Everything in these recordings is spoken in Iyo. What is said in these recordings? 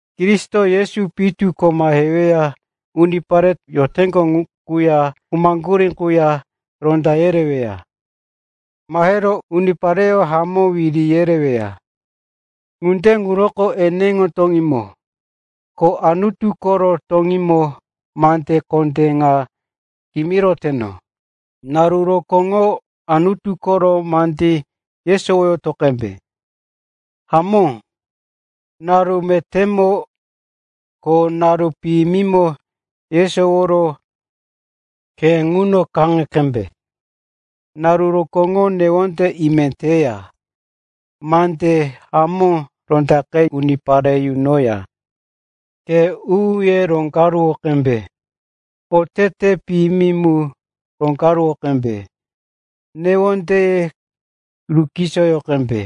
Kristo Yesu pitu ko mahero unipare yoteŋgo quya khumaŋgurí ŋuya ronda yereweya. Mahero unipareyó hamó wiri yereweya. Ŋunde ŋuroko eneŋo toŋímo, ko Anutu koro toŋímo mande kondé ŋa kimiroteno, naru rokóŋoro Anutu koro mande yesowoyoto qembe. Hamó, naru metémo, ko naru piyimimo yesowowero khe quno kaŋe qembe. Naru rokóŋoro newonde ime teya, mande hamó rondaqe unipare yunoya, khe u-uye roneneŋo qembe, oteteye piyimi mu roŋgaruwo qembe, newondeye rukisoyo qembe.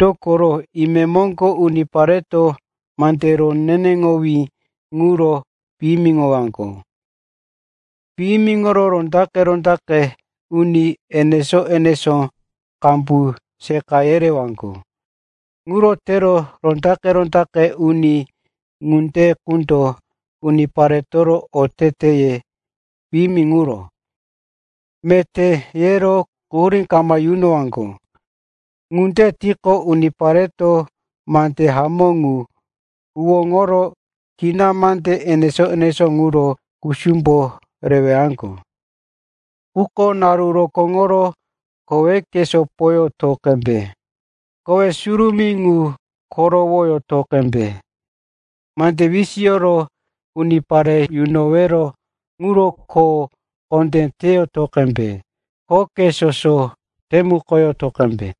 Dokoro, imemoŋgo unipareto mande roneneŋowí ŋuro piyimiŋowaŋgo. Piyimiŋoro rondaqe-rondaqe uni enesó-enesó qambu seqa yerewaŋgo. Ŋuro tero rondaqe-rondaqe uni ŋunde qundo uniparetoro oteteye piyimi ŋuro, “Meté,” yero quhurí kama yunowaŋgo. Ŋunde tiqo, unipareto mande hamó ŋu huwóŋoro kina mande enesó-enesó ŋuro kusumbo rewaŋgo. Quko naru rokóŋoro koweke sopoyoto qembe. Kowe surumí ŋu korowoyoto qembe. Mande wisiyoro unipare yunowero ŋuro kho kondé teyoto qembe. Khoke soso temukoyoto qembe.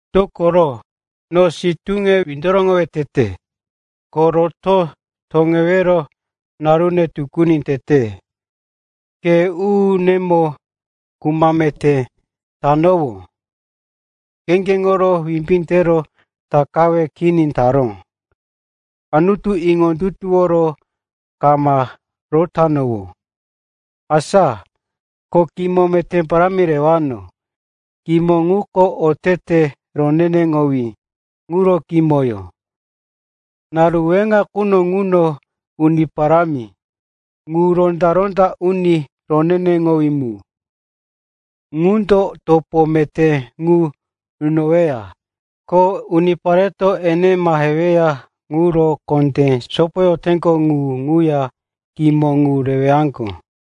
Dokoro, no sitúne windoroŋowe tete, ko roto toŋewero narune tukuni tete. Khe u-unemo kuma meté tanowó, kheŋgeŋoro wimbí tero takawe kini taró, Anutu iŋondutuworo kama rotanowó. Asa ko kimo meté parámi rewano. Kimo ŋuko otete roneneŋowí ŋuro kimoyó. Naru weŋa quno ŋuno Uni Parámi, ŋu Ronda-ronda Uni roneneŋowí mu, ŋundo topé meté ŋu nunoweya. Ko unipareto ene maheweya ŋuro kondé sopoyoteŋgo ŋu ŋuya kimo ŋu rewaŋgo.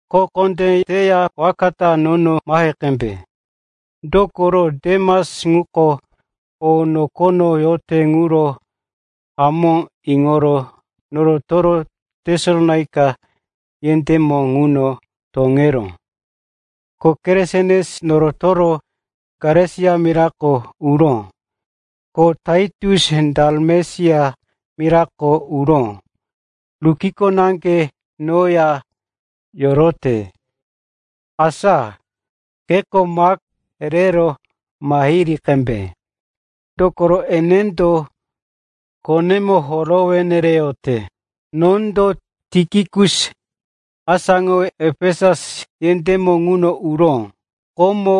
Kho kondé teya waka ta nono mahe qembe. Dokoro Demas ŋuko o nokono yote ŋuro hamó iŋoro norotoro Tesalonaika yendémo ŋuno toŋeró, ko Keresens norotoro Galesia mirako uró, ko Taitus Dalamesia mirako uró. Lukiko naŋge noya yorote. Asa keto Mak rero mahiri qembe, dokoro enendo khonemo horowe nereyote. Nondo Tikikus asáŋowe Efesus yendémo ŋuno uró. Komo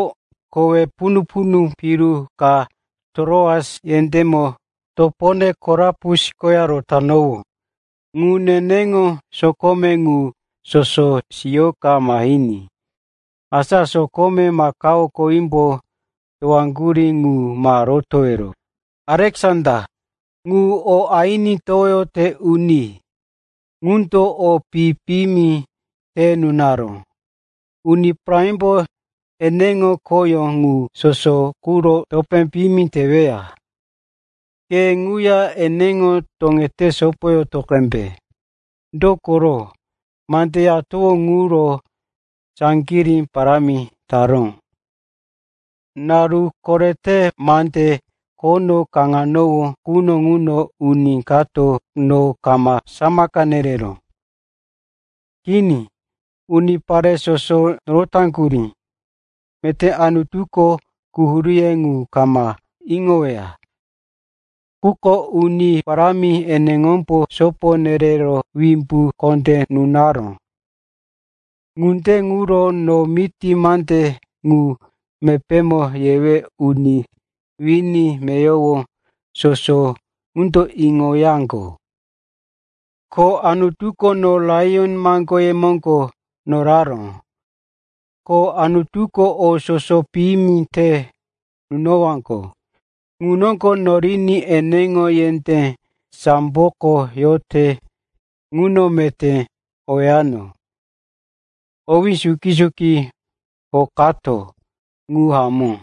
kowe punu-punu piru ka Tiroas yendémo topone Karupus koya rotanowó. Ŋuya neneŋo sokome ŋu soso siyika mahiní. Asa sokome makao kowímbo towaŋgurí ŋu ma rotowero. Aleksanda, ŋu o aini towoyote uni, ŋundo o pi-piyimi te nunaró. Uni Parámimbo eneŋo khoyó ŋu soso quro topé piyimi teweya. Ke ŋuya eneŋo toŋete sopoyoto qembe, dokoro mande yatowó ŋuro saŋgirí parámi taró. Naru korete mande khono kaŋanowó quno ŋuno uni kato no kama samaka nereró. Kini, unipare soso norotaŋgurí. Meté Anutuko quhuríye ŋuro kama iŋoweya. Quko Uni Parámi eneŋombo sopo nerero wimbu kondé nunaró. Ŋunde ŋuro no miti mande ŋu mepémo yewe uni wini meyowo soso ŋundo iŋoyaŋgo. Ko Anutuko no laiyon maŋgoye moŋgo noraró. Ko Anutuko o soso piyimi te nunowaŋgo ŋu noŋgo noriní eneŋo yendé samboko yote ŋuno meté owano. Owí suki-suki hokato. Ŋu hamó.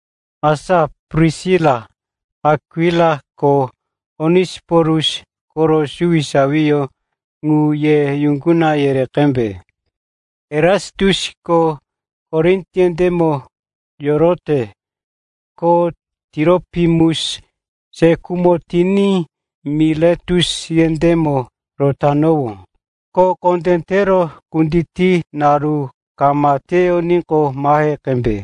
Asa Prisila, Akwila ko Onesiporus koro suwisawiyó ŋu ye yuŋguna yere qembe. Erasitusko Korin yendémo yorote, ko Tiropimus se khumo tiní Miletus yendémo rotanowó. Kho kondé tero kutiti naru kama teyoníqo mahe qembe.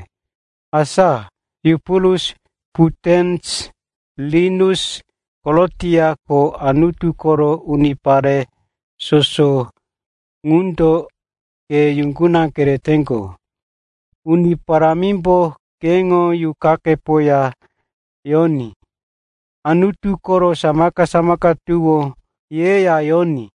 Asa Yupulus, Putens, Linus, Kolotia ko Anutu koro unipare soso ŋundo ke yuŋguna kereteŋgo. Uni Parámimbo keŋo yuqakepoya yoní. Anutu koro samaka-samaka tuwó yeya yoní.